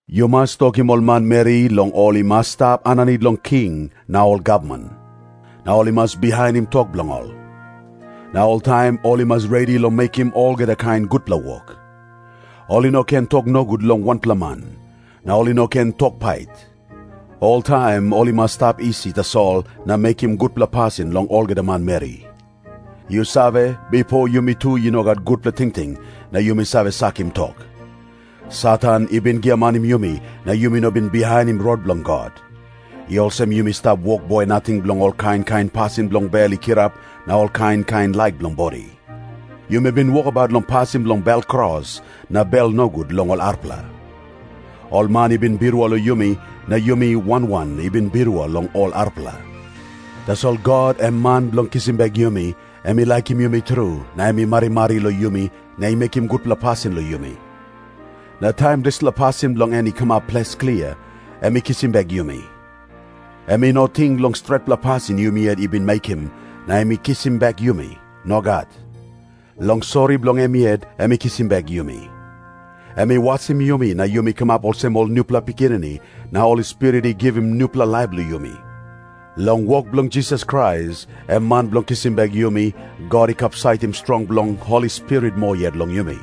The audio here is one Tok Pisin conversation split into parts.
Yu mas tokim ol manmeri long ol i mas stap aninit long ol king na ol gavman, na ol i mas bihainim tok bilong ol. Na oltaim ol i mas redi long mekim olgeta kain gutpela wok. Ol i no ken tok nogut long wanpela man, na ol i no ken tok pait. Oltaim ol i mas stap isi tasol na mekim gutpela pasin long olgeta manmeri. Yu save, bipo yumi tu i no gat gutpela tingting na yumi save sakim tok. Satan i bin giamanim yumi na yumi no bin bihainim rot bilong God. I olsem yumi stap wokboi nating bilong ol kain kain pasin bilong bel i kirap na ol kain kain laik bilong bodi. Yumi bin wokabaut long pasin bilong bel kros na bel nogut long ol arapela. Ol man i bin birua long yumi na yumi wan wan i bin birua long ol arapela. Tasol God, em Man bilong kisim bek yumi, em i laikim yumi tru, na em i marimari long yumi na mekim gutpela pasin long yumi. Na taim dispela pasin bilong en i kamap ples klia, em i kisim bek yumi. Em i no ting long stretpela pasin yumi yet i bin mekim, na em i kisim bek yumi. Nogat. Long sori bilong em yet em i kisim bek yumi. Em i wasim yumi na yumi kamap olsem ol nupela pikinini, na Holi Spirit i givim nupela laip long yumi. Long wok bilong Jisas Krais, em Man bilong kisim bek yumi, God i kapsaitim strong bilong Holi Spirit moa yet long yumi.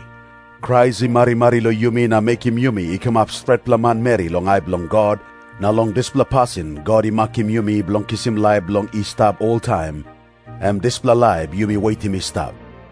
Krais i marimari long yumi na mekim yumi i kamap stretpela manmeri long ai bilong God, na long dispela pasin God i makim yumi bilong kisim laip bilong i stap oltaim, em dispela laip yumi wetim i stap.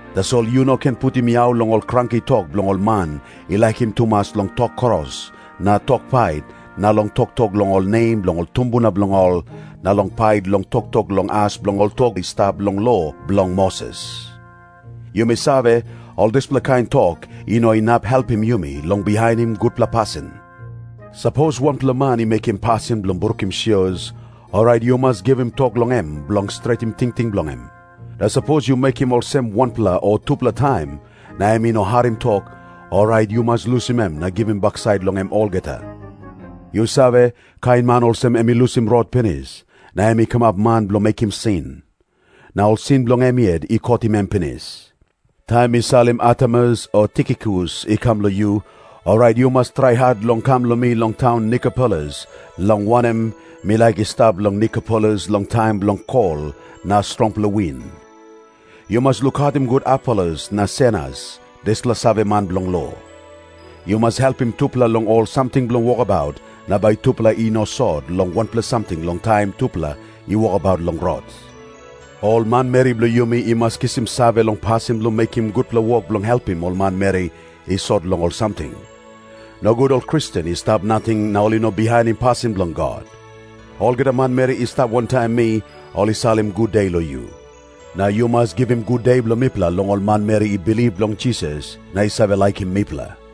Tasol yu no ken putim yau long ol kranki tok bilong ol man i laikim tumas long tok kros na tok pait na long toktok long ol nem bilong ol tumbuna bilong ol na long pait long toktok long as bilong ol tok i stap long lo bilong Moses. Yumi save, ol dispela kain tok i no inap helpim yumi long bihainim gutpela pasin. Sapos wanpela man i mekim pasin bilong brukim sios, orait yu mas givim tok long em bilong stretim tingting bilong em. Na sapos yu mekim olsem wanpela o tupela taim, na em i no harim tok, orait yu mas lusim em na givim baksait long em olgeta. Yu save, kain man olsem em i lusim rot pinis, na em i kamap man bilong mekim sin. Na ol sin bilong em yet i kotim em pinis. Taim mi salim Artemas o Tikikus i kam long yu, orait yu mas trai hat long kam long mi long taun Nikopolis, long wanem, mi laik i stap long Nikopolis long taim bilong kol na strongpela win. Yu mas lukautim gut Apolos na Senas, dispela saveman bilong lo. Yu mas helpim tupela long ol samting bilong wokabaut, na bai tupela i no sot long wanpela samting long taim tupela i wokabaut long rot. Ol manmeri bilong yumi i mas kisim save long pasin bilong mekim gutpela wok bilong helpim ol manmeri i sot long ol samting. Nogut ol Kristen i stap nating na ol i no bihainim pasin bilong God. Olgeta manmeri i stap wantaim mi, ol i salim gude long yu. Na yu mas givim gude bilong mipela long ol manmeri i bilip long Jisas na i save laikim mipela.